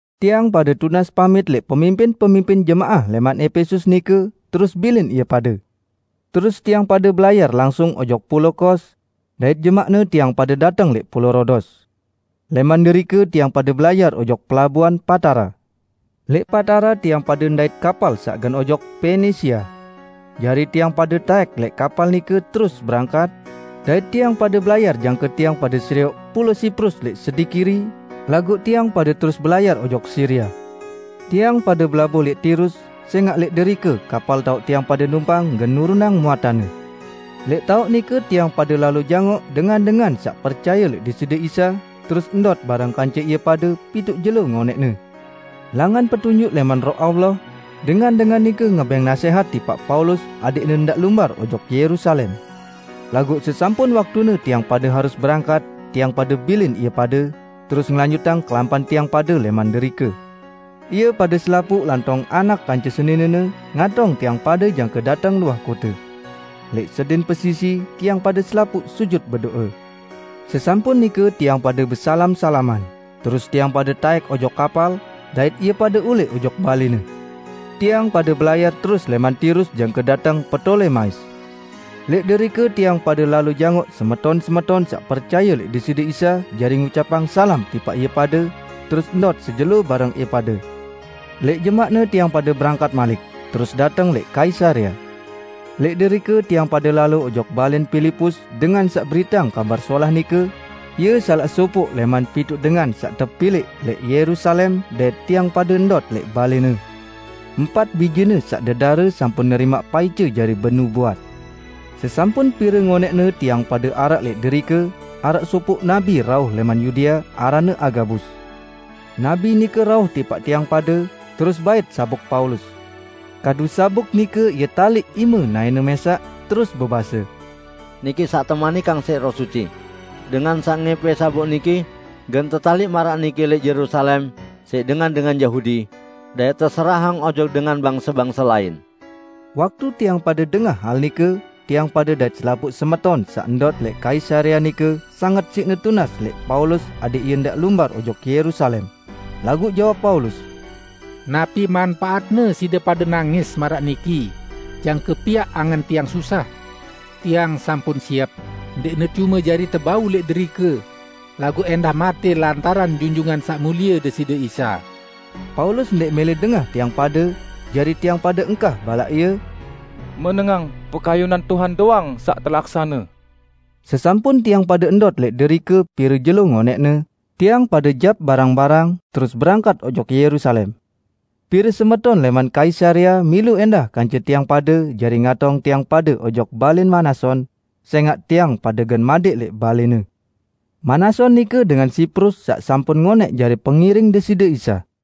Tiang pade tunas pamit lẽq pemimpin-pemimpin jemaah lẽman Epesus nike, terus bilin ie pade. Terus tiang pade belayar langsung ojok pulao Kos; dait jemaqne tiang pade dateng lẽq pulao Rodos. Lẽman derike tiang pade belayar ojok pelabuan Patara. Lẽq Patara tiang pade ndait kapal saq gen ojok Penisia. Jari tiang pade taẽk lẽq kapal nike terus berangkat dait tiang pade belayar jangke tiang pade serioq pulao Siprus lẽq sedi kiri, laguq tiang pade terus belayar ojok Siria. Tiang pade belabuh lẽq Tirus, sẽngaq lẽq derike kapal taoq tiang pade numpang gen nurunang muatanne. Lẽq taoq nike tiang pade lalo jangoq dengan-dengan saq percaye lẽq Deside Isa, terus ndot bareng kance ie pade pituq jelo ngonẽqne. Langan petunjuk lẽman Roh Allah, dengan-dengan nike ngebẽng nasẽhat tipaq Paulus adẽqne ndaq lumbar ojok Yerusalem. Laguq sesampun waktune tiang pade harus berangkat, tiang pade bilin ie pade, terus ngelanjutang kelampan tiang pade lẽman derike. Ie pade selapuq lantong anak kance seninene ngatong tiang pade jangke dateng luah kote. Lẽq sedin pesisi, tiang pade selapuq sujut bedo'e. Sesampun nike tiang pade besalam-salaman, terus tiang pade taẽk ojok kapal, dait ie pade ulẽq ojok balẽne. Tiang pade belayar terus lẽman Tirus jangke dateng Ptolemais. Lẽq derike tiang pade lalo jangoq semeton-semeton saq percaye lẽq Deside Isa jari ngucapang salam tipaq ie pade, terus ndot sejelo bareng ie pade. Lẽq jemaqne tiang pade berangkat malik, terus dateng lẽq Kaisarea. Lẽq derike tiang pade lalo ojok balẽn Pilipus dengan saq beriteang Kabar Solah nike, ie salaq sopoq lẽman pituq dengan saq tepilẽq lẽq Yerusalem, dait tiang pade ndot lẽq balẽne. Empat bijene saq dedare sampun nerimaq paice jari benubuat. Sesampun pire ngonẽqne tiang pade araq lẽq derike, araq sopoq nabi rauh lẽman Yudea, aranne Agabus. Nabi nike rauh tipaq tiang pade, terus bait sabuk Paulus. Kadu sabuk nike ie taliq ime naẽne mẽsaq, terus bebase, "Niki saq temanikang siq Roh Suci: Dengan saq ngẽpẽ sabuk niki gen tetaliq maraq niki lẽq Yerusalem siq dengan-dengan Yahudi, dait teserahang ojok dengan bangse-bangse lain." Waktu tiang pade dengah hal nike, tiang pade dait selapuq semeton saq ndot lẽq Kaisarea nike sanget siqne tunas lẽq Paulus adẽq ie ndaq lumbar ojok Yerusalem. Laguq jawab Paulus, "Napi manpaatne side pade nangis maraq niki jangke piaq angen tiang susah? Tiang sampun siep, ndẽqne cume jari tebau lẽq derike, laguq ẽndah matẽ lantaran Junjungan Saq Mulie Deside Isa." Paulus ndẽq mẽlẽ dengah tiang pade, jari tiang pade engkah balaq ie, "Menengang, pekayunan Tuhan doang saq telaksane." Sesampun tiang pade ndot lẽq derike pire jelo ngonẽqne, tiang pade barang-barang, terus berangkat ojok Yerusalem. Pire semeton lẽman Kaisarea milu ẽndah kance tiang pade jari ngatong tiang pade ojok balẽn Manason, sẽngaq tiang pade gen madẽq lẽq balẽne. (Manason nike dengan Siprus saq sampun ngonẽq jari pengiring Deside Isa.)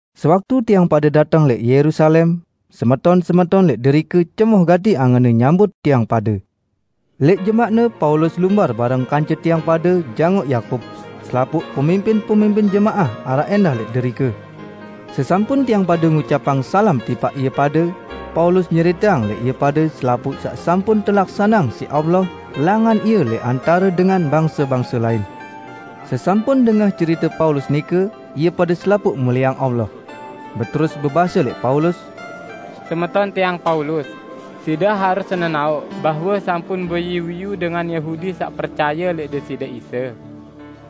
Sewaktu tiang pade dateng lẽq Yerusalem, semeton-semeton lẽq derike cemoh gati angenne nyambut tiang pade. Lẽq jemaqne Paulus lumbar bareng kance tiang pade jangoq Yakub; selapuq pemimpin-pemimpin jemaah araq ẽndah lẽq derike. Sesampun tiang pade ngucapang salam tipaq ie pade, Paulus nyeriteang lẽq ie pade selapuq saq sampun telaksaneang siq Allah langan ie lẽq antare dengan bangse-bangse lain. Sesampun dengah cerite Paulus nike, ie pade selapuq mulieang Allah. Beterus bebase lẽq Paulus, "Semeton tiang Paulus, side harus nenaoq bahwe sampun beiyu-iyu dengan Yahudi saq percaye lẽq Deside Isa.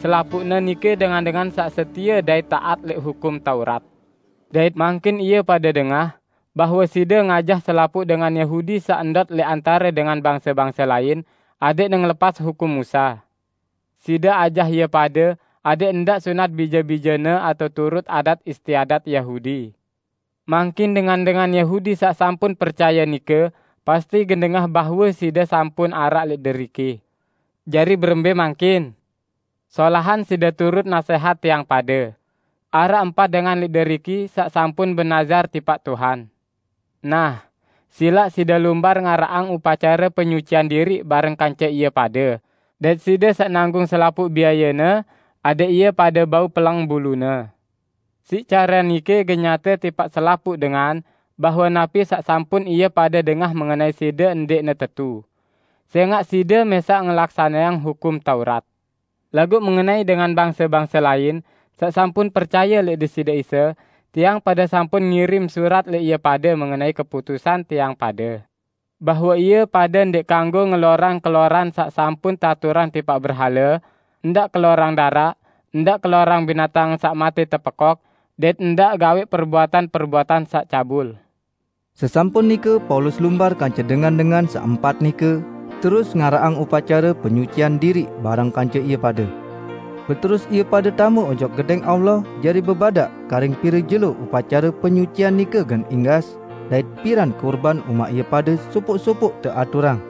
Selapuqne nike dengan-dengan saq setie dait taat lẽq Hukum Taurat. Dait mangkin ie pade dengah bahwe side ngajah selapuq dengan Yahudi saq ndot lẽq antare dengan bangse-bangse lain adẽqne ngelepas hukum Musa. Side ajah ie pade adẽq ndaq sunat bije-bijene atao turut adat istiadat Yahudi. Mangkin dengan-dengan Yahudi saq sampun percaye nike pasti gen dengah bahwe side sampun araq lẽq deriki. Jari berembẽ mangkin? Solahan side turut nasẽhat tiang pade. Araq empat dengan lẽq deriki saq sampun benazar tipaq Tuhan. Nah, silaq side lumbar ngaraqang upacare penyucian diriq bareng kance ie pade, dait side saq nanggung selapuq biayene, adẽq ie pade bau peleng bulune. Siq care nike gen nyate tipaq selapuq dengan bahwe napi saq sampun ie pade dengah mengenai side ndẽqne tetu, sẽngaq side mẽsaq ngelaksaneang Hukum Taurat. Laguq mengenai dengan bangse-bangse lain, saq sampun percaye lẽq Deside Isa, tiang pade sampun ngirim surat lẽq ie pade mengenai keputusan tiang pade, bahwe ie pade ndẽq kanggo ngelorang keloran saq sampun teaturang tipaq berhale, ndaq kelorang daraq, ndaq kelorang binatang saq matẽ tepekok; dait ndaq gawẽq perbuatan-perbuatan saq cabul." Sesampun nike Paulus lumbar kance dengan-dengan saq empat nike, terus ngaraqang upacare penyucian diriq bareng kance ie pade. Beterus ie pade tame ojok Gedẽng Allah jari bebadaq karing pire jelo upacare penyucian nike gen inggas, dait piran kurban umaq ie pade sopoq-sopoq teaturang.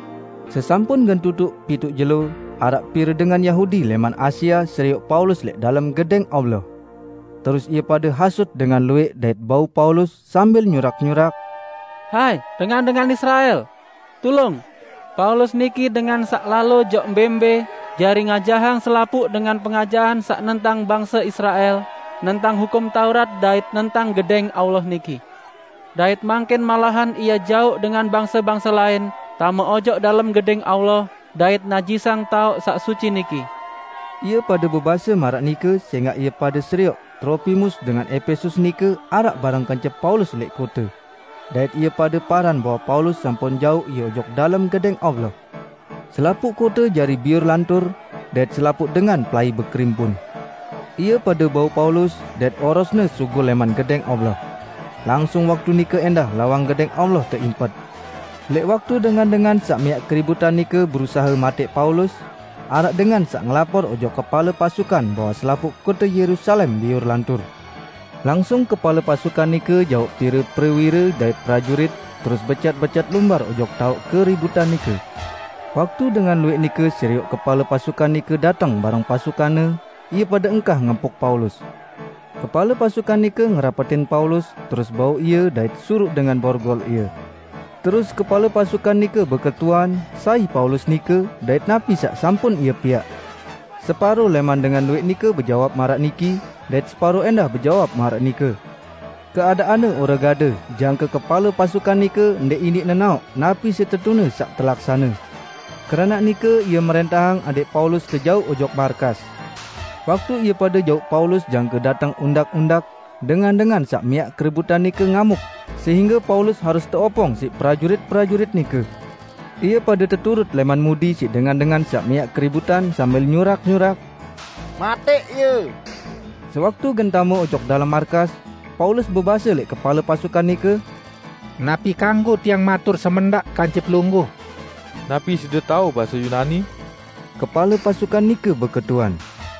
Sesampun gen tutuq pituq jelo, araq pire dengan Yahudi lẽman Asia serioq Paulus lẽq dalem Gedẽng Allah. Terus ie pade hasut dengan luwẽq dait bau Paulus sambil nyurak-nyurak, "Hai, dengan-dengan Israel! Tulung! Paulus niki dengan saq lalo ojok mbẽ-mbẽ jari ngajahang selapuq dengan pengajahan saq nentang bangse Israel, nentang Hukum Taurat dait nentang Gedẽng Allah niki. Dait mangkin malahan ie jauq dengan bangse-bangse lain tame ojok dalem Gedẽng Allah dait najisang taoq saq suci niki!" ( Ie pade bebase maraq nike sẽngaq ie pade serioq Tropimus dengan Epesus nike araq bareng kance Paulus lẽq kote; dait ie pade paran bahwe Paulus sampun jauq ie ojok dalem Gedẽng Allah.) Selapuq kote jari biur lantur, dait selapuq dengan pelai bekerimpun. Ie pade bau Paulus, dait orosne sugul lẽman Gedẽng Allah. Langsung waktu nike ẽndah lawang Gedẽng Allah teimpet. Lẽq waktu dengan-dengan saq miaq keributan nike berusahe matẽq Paulus, araq dengan saq ngelapor ojok kepale pasukan bahwe selapuq kote Yerusalem biur lantur. Langsung kepale pasukan nike jauq pire prewire dait prajurit, terus becat-becat lumbar ojok taoq keributan nike. Waktu dengan luwẽq nike serioq kepale pasukan nike dateng bareng pasukanne, ie pade engkah ngempuk Paulus. Kepale pasukan nike ngerapetin Paulus, terus bau ie dait suruq dengan borgol ie. Terus kepale pasukan nike beketuan, sai Paulus nike dait napi saq sampun ie piaq. Separo lẽman dengan luwẽq nike bejawab maraq niki dait separo ẽndah bejawab maraq nike. Keadaanne ore gade jangke kepale pasukan nike ndẽq iniq nenaoq napi setetune saq telaksane. Keranaq nike ie mrẽntahang adẽq Paulus tejauq ojok markas. Waktu ie pade jauq Paulus jangke dateng undak-undak, dengan-dengan saq miaq keributan nike ngamuk sehingge Paulus harus teopong siq prajurit-prajurit nike. Ie pade teturut lẽman mudi siq dengan-dengan saq miaq keributan sambil nyurak-nyurak, "Matẽq ie!" Sewaktu gen tame ojok dalem markas, Paulus bebase lẽq kepale pasukan nike, "Napi kanggo tiang matur semendaq kance pelungguh?" "Napi side tao base Yunani?" kepale pasukan nike beketuan.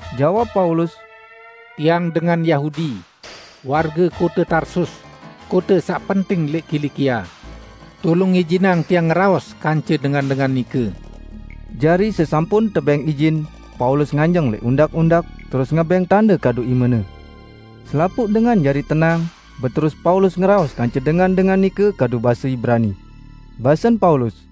Jawab Paulus, "Tiang dengan Yahudi, warge kote Tarsus, kote saq penting lẽq Kilikia. Tulung ijinang tiang ngeraos kance dengan-dengan nike." Jari sesampun tebẽng ijin, Paulus nganjeng lẽq undak-undak, terus ngebẽng tande kadu imene. Selapuq dengan jari tenang, beterus Paulus ngeraos kance dengan-dengan nike kadu base Ibrani. Basen Paulus,